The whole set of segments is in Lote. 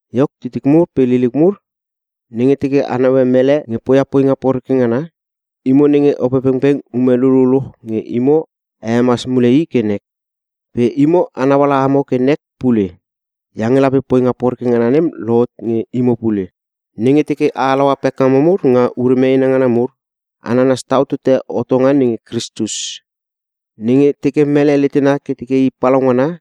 Iok titik mur pe liliuk mur, nenge teke a naue mele nge poia poinga poreke ngana, imo nenge Opepengpeng ume lululuch nge imo a hemas mule i ke nek. Pe imo a nauala amo ke nek pule; iange lape poinga poreke ngana nem lohot nge imo pule. Nenge teke a halaua pekngamo mur nga ure meena ngana mur, a nanas tau tote hotonga nenge Kristus. Nenge teke mele letena ke teke i palaungana,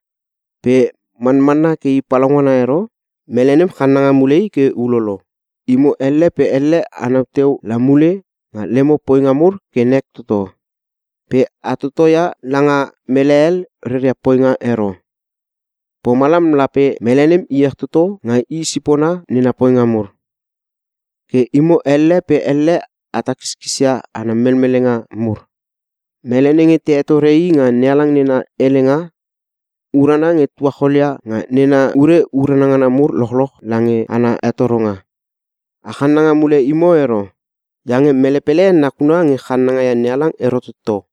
pe manmanna ke i palaungana ero, mele nem channanga mule i ke ulolo. Imo elle pe elle anau teu la mule nga lemo poinga mur ke nek toto, pe a totoia langa mele hel reria poinga ero. Pomalam lape mele nem iech toto nga i sipona nena poinga mur. Ke imo elle pe elle a takiskisia ana melmelenga mur. Mele nenge te hetore i nga NeHalang nena helenga, urana nge tuacholia nga nena ure urana ngana mur lochloch lange ana hetoronga. A chananga mule imo ero. Iange mele pele nakuna nge channanga ia NeHalang ero toto.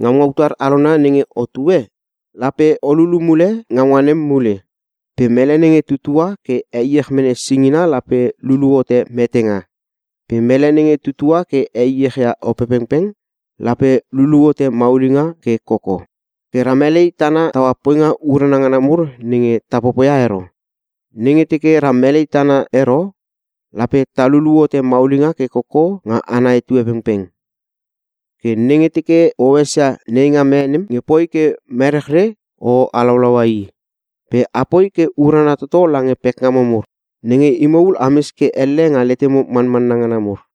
Ngaunga utar alona nenge otue, lape o lulu mule ngaunga nem mule. Pe mele nenge tutua ke heiech mene singina lape lulu hote metenga. Pe mele nenge tutua ke heiech ia Opepengpeng, lape lulu hote maulinga ke koko. Ke ra melei tana taua poinga urana ngana mur nenge ta popoia ero. Nenge teke ra melei tana ero, lape ta lulu hote maulinga ke koko nga ana etue pengpeng. Ke nenge teke o esia neingam e nem nge poi ke merechre, o halaulaua i. Pe apoi ke urana toto lange pekngamo mur, nenge imo ul ames ke elle nga letemo manmanna ngana mur.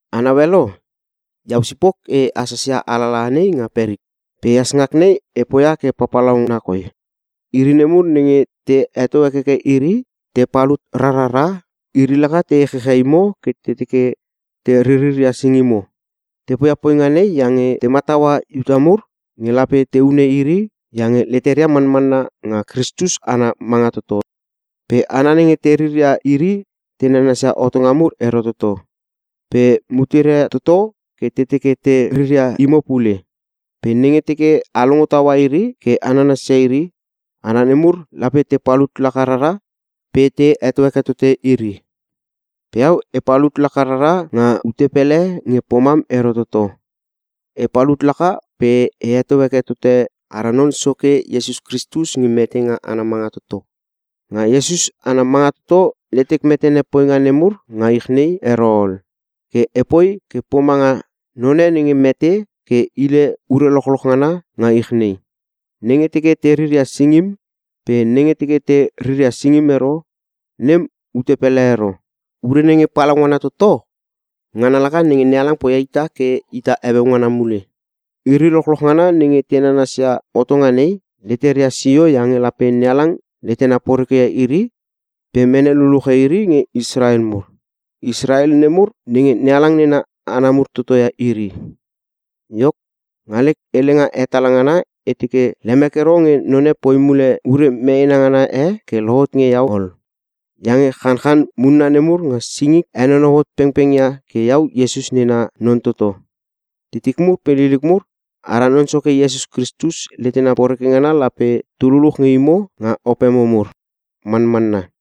A naue lo? Iau sipok e hasas ia alalaha nei nga perik. Pe ehas ngak nei e poia ke papalauna koi! Iri nemur nenge te heto hekeke iri pe te palut rarara, iri laka te echechia imo ke te teke te ririria singimo. Te poia poinga nei iange te mataua Iuta mur nge lape te hune iri iange leteria manmanna nga Kristus ana manga toto. Pe hana nenge te riria iri te nanasia hotonga mur ero toto. Pe muteria toto ke te teke te riria imo pule. Pe nenge teke a longo taua iri ke a nanasia iri, hana nemur lape te palut laka rara pe te heto heke tote iri. Pe iau, e palut laka rara nga ute pele nge pomam ero toto. E palut laka pe e heto heke tote ara Non Soke, Iesus Kristus nge mete nga ana manga toto. Nga Iesus ana manga toto letek metene poinga nemur nga ich nei ero ol. Ke epoi ke pomanga none nenge mete ke hile ure lochloch ngana nga ich nei. Nenge teke te riria singim pe nenge teke te riria singim ero, nem ute pele ero. Ure nenge palaungana toto ngana laka nenge NeHalang poia ita ke ita heueu ngana mule. Iri lochloch ngana nenge te nanasia hotonga nei, leteria sio iange lape NeHalang letena porekeia iri pe mene luluche iri nge Israel mur. Israel nemur nenge NeHalang nena hana mur toto ia iri. Iok, nga lek helenga hetala ngana e teke, lemek ero nge none poi mule ure meena ngana e ke lohot nge iau ol. Iange chanchan munna nemur nga singik henonou hot pengpengia ke iau Iesus nena non toto. Titik mur pe liliuk mur, ara Non Soke Iesus Kristus letena poreke ngana lape tu luluch nge imo nga opemo mur. Manmanna.